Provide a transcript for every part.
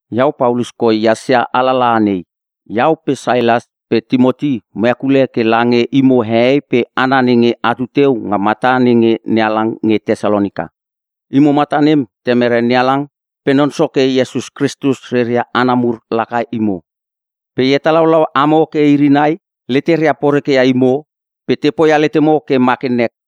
Iau Paulus koi ehas ia alalaha nei. Iau pe Sailas pe Timoti mo hekule ke lange imo hehei pe hana nenge atu teu nga mata nenge NeHalang nge Tesalonika. Imo mata nem Temere NeHalang pe Non Soke Iesus Kristus reria hana mur laka imo. Pe e hetalaulau amo ke iri nai leteria poreke ia imo pe te poia letemo ke ma ke nek.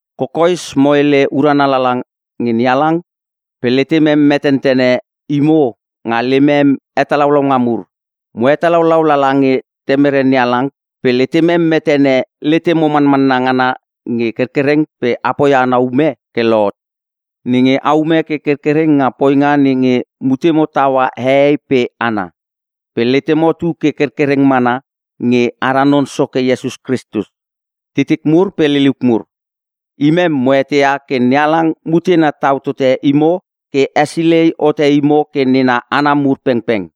Kokoes mo hele urana lala nge NeHalang pe letemem metentene imo nga lemem hetalaulaunga mur. Mo hetalaulau lala nge Temere NeHalang pe letemem metene letemo manmanna ngana nge kerkereng pe a poia ana ume ke lohot, nenge aume ke kerkereng nga poinga nenge mutemo taua hehei pe hana, pe letemo tu ke kerkereng mana nge ara Non Soke Iesus Kristus. Titik mur pe liliuk mur, imem mo eteia ke NeHalang mutena tau tote imo pe hesilei hote imo ke nena hana mur pengpeng,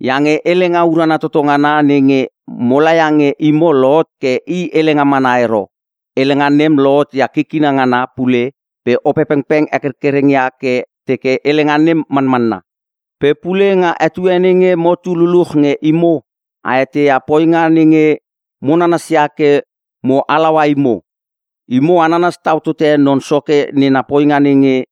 iange helenga urana toto ngana nenge mola ia nge imo lohot ke i helenga mana ero. Helenga nem lohot ia kikina ngana pule pe Opepengpeng hekerkereng ia ke teke helenga nem manmanna. Pe pule nga etue nenge motu luluch nge imo, a eteia poinga nenge mo nanasia ke mo halaua imo. Imo a nanas tau tote Non Soke nena poinga nenge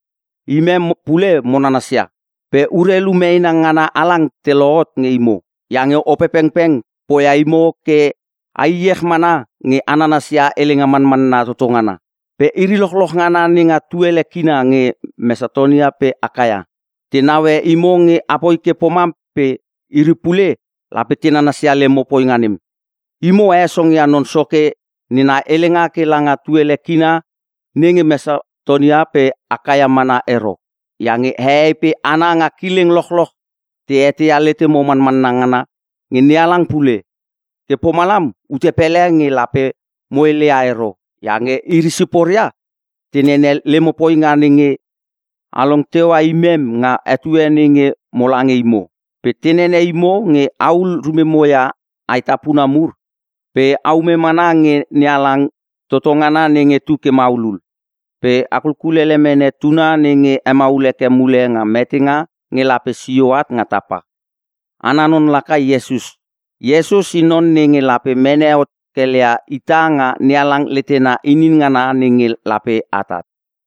imem pule mo nanasia. Pe urelu meena ngana halang te lohot nge imo, iange Opepengpeng poia imo ke a iech mana nge a nanasia helenga manmanna toto ngana. Pe iri lochloch ngana nenga tuele kina nge Mesatonia pe Akaia, te naue imo nge apoi ke pomam pe iri pule lape te nanasia lemo poinga nem. Imo a hesongia Non Soke nena helenga ke langa tuele kina nenge Mesatonia pe Akaia mana ero, iange hehei pe hana nga kileng lochloch te eteia letemo manmanna ngana nge NeHalang pule. Ke pomalam ute pele nge lape mo heleia ero iange iri siporia te nenene lemo poinga nenge along teua imem nga etue nenge mo lange imo. Pe te nene imo nge ahul rumemo ia aetapuna mur pe aume mana nge NeHalang toto ngana nenge tu ke maulul. Pe a kulkulele mene Tuna nenge hemaul heke mule nga metenga nge lape sio at nga tapa. Ana non laka Iesus. Iesus i non nenge lape mene hot kelia ita nga NeHalang letena inin ngana nenge lape atat.